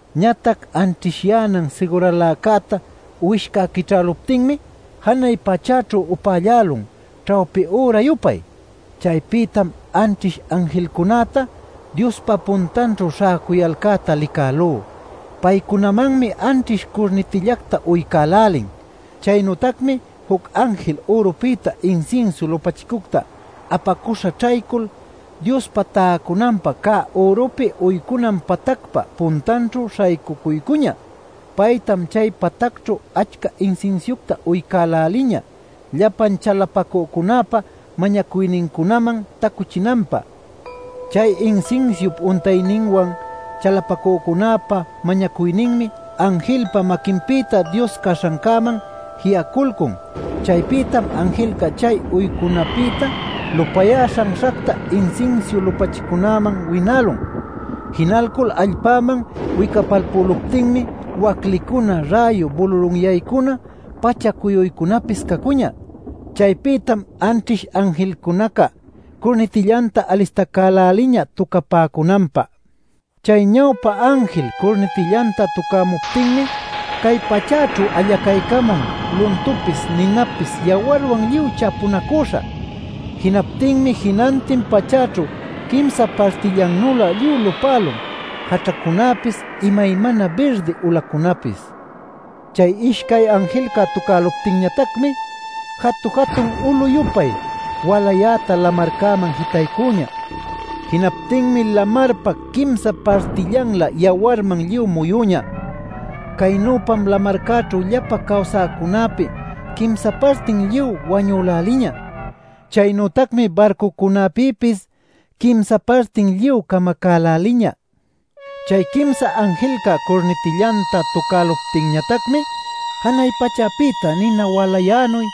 Ñatac anćhishyänan siguraläcäta Uwishca quićhäluptinmi janay pachäćhu upällälun ćhawpi üra-yupay. Chaypïtam anćhish anjilcunäta Diospa puntanćhu śhäcuyalcäta licälú. Paycunamanmi anćhish curnitillacta uycälälin. Chaynütacmi juc anjil ürupïta insinsiu lupachicucta apacuśha ćhaycul Diospa täcunanpa cä ürupi uycunan patacpa puntanćhu śhaycucuycuñä. Paytam chay patacćhu achca insinsiucta uycäläliñä llapan chalapacücunäpa mañacuynincunaman tacuchinanpä. Chay insinsiup untayninwan chalapacücunäpa mañacuyninmi anjilpa maquinpïta Dios caśhancäman ji'aculcun. Chaypïtam anjilca chay uycunapïta lupayä śhanśhacta insinsiu lupachicunäman winälun. Jinalcul allpäman wicapalpüluptinmi waclicuna, räyu bululunyaycuna, pacha-cuyuycunapis cacuñä. Chaypïtam anćhish anjilcunaca curnitillanta alistacäläliñä tucapäcunanpä. Chay ñawpä anjil curnitillanta tucämuptinmi cay pachäćhu allacaycamun luntupis, ninapis yawarwan lluy chapunacüśha. Jinaptinmi jinantin pachäćhu quimsa partillannülä lluy lupälun jaćhacunapis, imaymana birdi ulacunapis. Chay ishcay anjilca tucäluptinñatacmi jatu-jatun ulu-yupay walayäta lamarcäman jitaycüñä. Jinaptinmi lamarpa quimsa partillanlä yawarman lluy muyüñä. Caynüpam lamarcäćhu llapa cawsäcunapi quimsa partin lluy wañüläliñä. Chaynütacmi barcucunäpïpis quimsa partin lluy camacäläliñä. Chay quimsa anjilca curnitillanta tucäluptinñatacmi janay pachäpïta nina walayänuy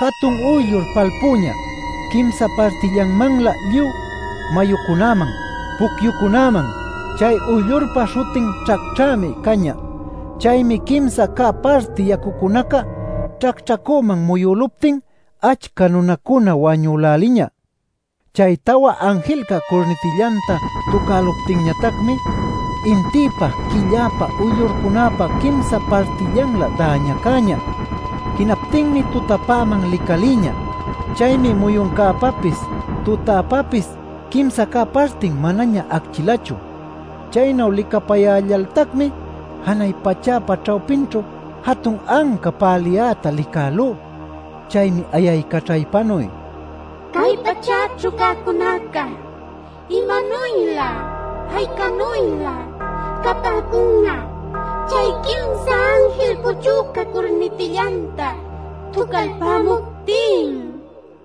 jatun uyllur palpüñä quimsa partillanmanlä lluy mayucunäman, pucyucunäman. Chay uyllurpa śhutin “Ćhacćhämi” cañä. Chaymi quimsa cä parti yacucunaca ćhacćhacüman muyüluptin achca nunacuna wañüläliñä. Chay tawa anjilca curnitillanta tucäluptinñatacmi intïpa, quilläpa, uyllurcunäpa quimsa partillanlä däñacäñä. Jinaptinmi tutapäman licalïñä. Chaymi muyuncäpapis tutäpapis quimsa cä partin manaña acchilachu. Chaynu licapayällaltacmi janay pachäpa ćhawpinćhu jatun anca päliyäta licälú. Chaymi ayaycaćhaypanuy: “¡Cay pachäćhu cäcunaca imanuylä aycanuylä capäcun'a chay quimsa anjil puchüca curnitillanta tucalpämuptin!” niyämuñä.